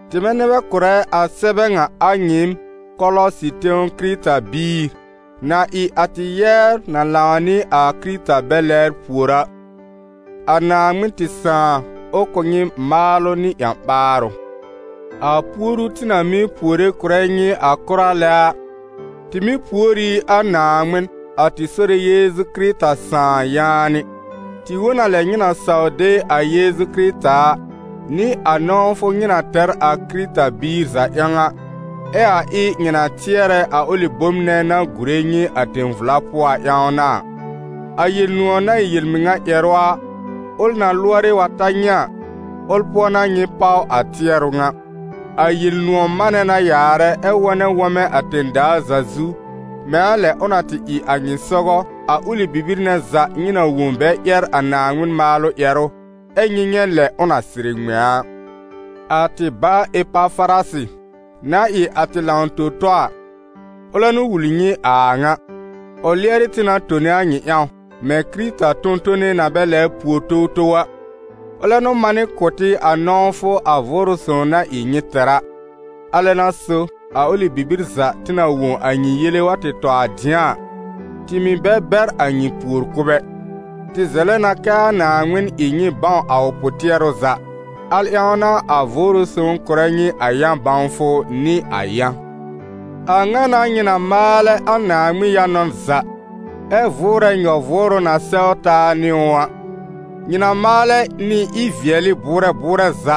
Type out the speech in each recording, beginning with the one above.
tɩmɛ nɛ bɛ kʋ̀rɛ a sɛbɛ ŋa, a nyɩɩm, Kɔlɔsɩ tẽw Kɩrɩta-biir na ɩ a tɩ yɛbr na lãw nɩ a Kɩrɩta bɛ lɛbr pùor a. A Naaŋmɩn tɩ Sãà, ʋ kʋ̀ nyɩ maalʋ nɩ ƴã-ɓaarʋ. A puoru tɩ na mɩ́ puore kʋ̀rɛ nyɩ a kʋra lɛ a, tɩ mɩ́ pùor ɩ a Naaŋmɩn, a tɩ Sore Yeezu Kɩrɩta Sãà, yaanɩ. Tɩ wõ n a lɛ nyɩ na saw de a Yeezu Kɩrɩta a, nɩ a nɔ̃wfʋ nyɩ na tɛr a Kɩrɩta-biir za ƴãw a, ɛ a ɩ nyɩ na tɩɛrɛ a ʋlɩ bom nɛ na gùre nyɩ a tẽ-vla pʋɔ a ƴãw n'a a. A Yel-nʋ̃ɔ̀ na ɩ yel-mɩŋa ƴɛrʋ a, ʋl na lʋɔrɩ wa ta nyɩ a, ʋl pʋɔ n'a nyɩ páw a tɩɛrʋ ŋa. A Yel-nʋ̃ɔ̀ manɛ na yaarɛ ɛ́ wɔnɛ wɔmɛ̃ a tẽ-daa za zu, mɛ̃ a lɛ ʋ na tɩ ɩ a nyɩ sɔgɔ a ʋlɩ bibir nɛ za nyɩ na wõ bɛ ƴɛr a Naaŋmɩn maalʋ ƴɛrʋ, ɛ́ nyɩ nyɛ̃ lɛ ʋ na sɩrɩ ŋmɛ̃ a. A tɩ ba Epafarasɩ, na ɩ a tɩ lãw-tõ-tɔ a, ʋlɛ n'ʋ wul nyɩ a a ŋa. Ʋ lɩɛrɩ tɩ na tone a nyɩ ƴãw, mɛ̃ Kɩrɩta tõ-tone na bɛ lɛbr pùor towtow a. Ʋlɛ n'ʋ manɩ kʋ̀ tɩ a nɔ̃wfʋ a Vʋʋrʋ Sõw na ɩ nyɩ tɛr a. A lɛ n'a so a ʋlɩ bibir za tɩ na wõ a nyɩ yele wa tɩ tɔ a dɩ̃a a, tɩ mɩ̀ bɛ bɛr a nyɩ puor-kʋ̀b ɛ. Tɩ zɛlɛ na kɛ a Naaŋmɩn ɩ nyɩ bãw a ʋ pʋ-tɩɛrʋ za. Al ƴãw n'a a Vʋʋrʋ Sõw kʋ̀rɛ nyɩ a yã-bãwfʋ nɩ a yã. A ŋa n'a nyɩ na maalɛ a Naaŋmɩn yã-nɔn za, ɛ vʋʋrɛ nyɔ-vʋʋrʋ na sɛw taa nɩ ʋ a. Nyɩ na maalɛ nɩ ɩ-vɩɛlɩ bʋʋrɛ bʋʋrɛ za,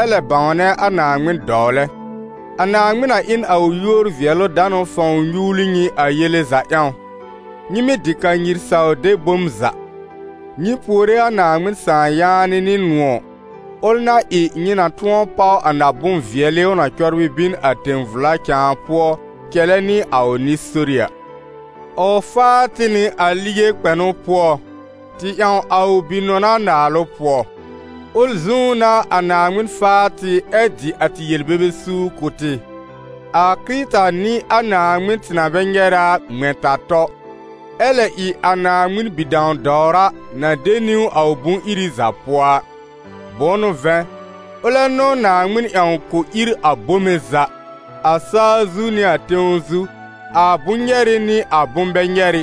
ɛ lɛ bãwnɛ a Naaŋmɩn dɔwlɛ. A Naaŋmɩn na ɩ n a ʋ yúor-vɩɛlʋ-danʋ fãw nyuwli nyɩ a yele za ƴãw, nyɩ mɩ́ dɩ kanyir saw de bom za. Nyɩ puore a Naaŋmɩn Sãà yaanɩ nɩ nʋ̃ɔ̀, ʋl na ɩ nyɩ na tʋ̃ɔ páw a na-bʋ̃-vɩɛlɩ ʋ na cɔbrɩ bin a tẽ-vla cãa pʋɔ cɛlɛ nɩ a ʋ nɩ-sori a. Ʋ faa tɩ nɩ a lige kpɛnʋ pʋɔ, tɩ ƴãw a ʋ Bi-nɔna naalʋ pʋɔ. Ʋl zũú n'a a Naaŋmɩn faa tɩ ɛ dɩ a tɩ yel-bebe suur kʋ̀ tɩ. A Kɩrɩta n'ɩ a Naaŋmɩn tɩ na bɛ nyɛrɛ a, ŋmɛ̃-ta-tɔ, ɛ lɛ ɩ a Naaŋmɩn bi-dãw-dɔwra na de niwn a ʋ bʋ̃-iri za pʋɔ a. Bʋ̃ʋ n'ʋ vɛ̃, ʋlɛ n'ʋ Naaŋmɩn ƴãw k'ʋ ír a bome za, a sa-zu nɩ a tẽw zu, a bʋ̃-nyɛrɩ nɩ a bʋ̃-bɛ-nyɛrɩ,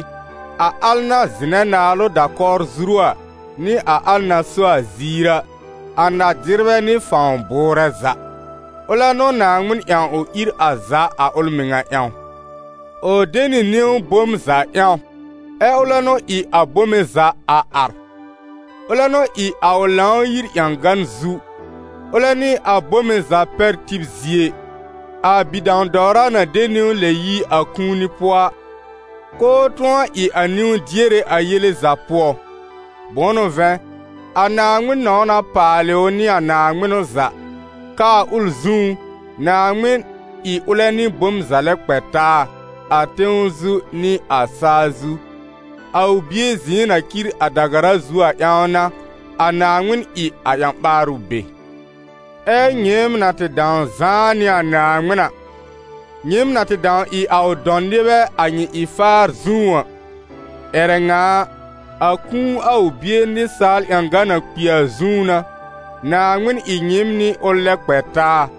a al na zɩnɛ naalʋ da-kɔwr zuru a, nɩ a al na so a ziir a, a na-dɩrbɛ nɩ fãw bʋʋrɛ za. Ʋlɛ n'ʋ Naaŋmɩn ƴãw ʋ ír a za a ʋl mɩŋa ƴãw. Ʋ de nɩ niwn be bom za ƴãw, ɛ ʋlɛ n'ʋ ɩ a bome za a ar. Ʋlɛ n'ʋ ɩ a ʋ Lãw-yir ƴãgan zu, ʋlɛ n'ɩ a bome za pɛr-tib zie, a bi-dãw-dɔwra na de niwn lɛb yi a kũuni pʋɔ a, k'ʋʋ tʋ̃ɔ ɩ a niwn-diere a yele za pʋɔ a. Bʋ̃ʋ n'ʋ vɛ̃, a Naaŋmɩn nɔ̃w na paalɩ ʋ nɩ a naaŋmɩnʋ za, k'aa ʋl zũú, Naaŋmɩn ɩ ʋlɛ nɩ bom za lɛ kpɛ taa, a tẽw zu nɩ a sa-zu. A ʋ Bie zɩ̃ɩ na cir a da-gara zu a ƴãw n'a, a Naaŋmɩn ɩ a ƴã-ɓaarʋ be. Ɛ nyɩɩm na tɩ dãw zãá nɩ a Naaŋmɩn a, nyɩɩm na tɩ dãw ɩ a ʋ dɔ̃ nɩbɛ a nyɩ ɩ-faar zũú a, ƴɛrɛ ŋa a, a kũu a ʋ Bie nɩsaal ƴãgan na kpi a zũú n'a, Naaŋmɩn ɩ nyɩɩm nɩ ʋl lɛ kpɛ taa,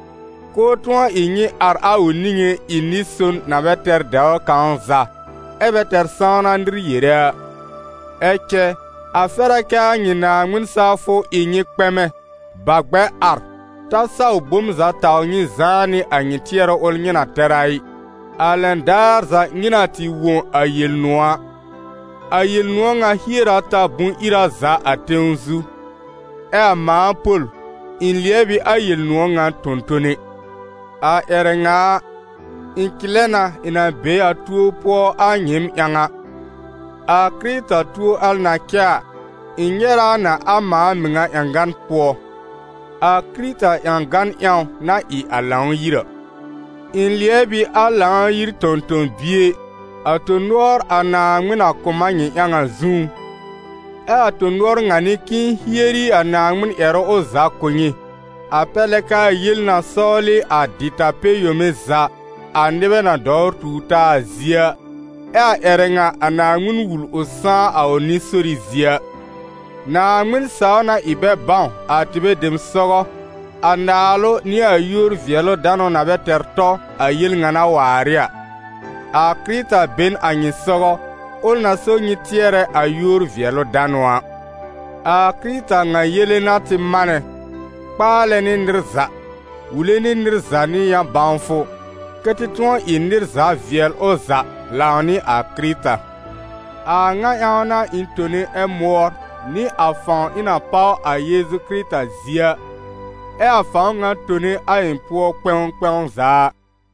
k'ʋʋ tʋ̃ɔ ɩ nyɩ ar a ʋ niŋé ɩ nɩ-son na bɛ tɛr dɛwr kãw za, ɛ́ bɛ tɛr sãwna nɩr yere a. Ɛ cɛ a fɛr a kɛ a nyɩ Naaŋmɩn sawfʋ ɩ nyɩ kpɛmɛ, bà gbɛr ar, ta saw bom za taw nyɩ zãá nɩ a nyɩ tɩɛrʋ ʋl nyɩ na tɛr a ɩ, a lɛn daar za nyɩ na tɩ wõ a Yel-nʋ̃ɔ̀ a. A Yel-nʋ̃ɔ̀ ŋa hier a ta bʋ̃-ira za a tẽw zu, ɛ a mãa Pol, ɩ̃ lɩɛb ɩ a Yel-nʋ̃ɔ̀ ŋa tõ-tone. A ƴɛrɛ ŋa a, ɩ̃ cɩlɛ na ɩ̃ na be a tuo pʋɔ a nyɩɩm ƴãw a. A Kɩrɩta tuo al na cɛ a, ɩ̃ nyɛrɛ a na a mãa mɩŋa ƴãgan pʋɔ, a Kɩrɩta ƴãgan ƴãw na ɩ a Lãw-yir a. Ɩ̃ lɩɛb ɩ a Lãw-yir tõ-tõ-bie, a tõ-nʋɔr a Naaŋmɩn na kʋ̀ m a nyɩ ƴãw a zũú. Ɛ a tõ-nʋɔr ŋa n'ɩ k'ɩ̃ɩ hieri a Naaŋmɩn ƴɛrʋ ʋ za kʋ̀ nyɩ, a pɛr lɛ kɛ a yel na sɔwlɩ a dɩta-pɛ-yome za a nɩbɛ na dɔwr tuur taa zie a, ɛ a ƴɛrɛ ŋa a Naaŋmɩn wul ʋ sãá a ʋ nɩ-sori zie a. Naaŋmɩn saw na ɩ bɛ bãw, a tɩbɛ dem sɔgɔ, a naalʋ nɩ a yúor-vɩɛlʋ-danʋ na bɛ tɛr tɔ, a yel ŋa na waar ɩ a: a Kɩrɩta be n a nyɩ sɔgɔ, ʋl na só nyɩ tɩɛrɛ a yúor-vɩɛlʋ-danʋ a. A Kɩrɩta ŋa yele n'a tɩ manɛ, kpaalɛ nɩ nɩr za, wule nɩ nɩr za nɩ yã-bãwfʋ, kɛ́ tɩ tʋ̃ɔ ɩ nɩr za vɩɛl ʋ za lãw nɩ a Kɩrɩta. A a ŋa ƴãw n'a ɩ̃ tone ɛ mʋɔr, nɩ a fãw ɩ̃ na páw a Yeezu Kɩrɩta zie a, ɛ a fãw ŋa tone a ɩ̃ pʋɔ kpɛ̃w kpɛ̃w za a.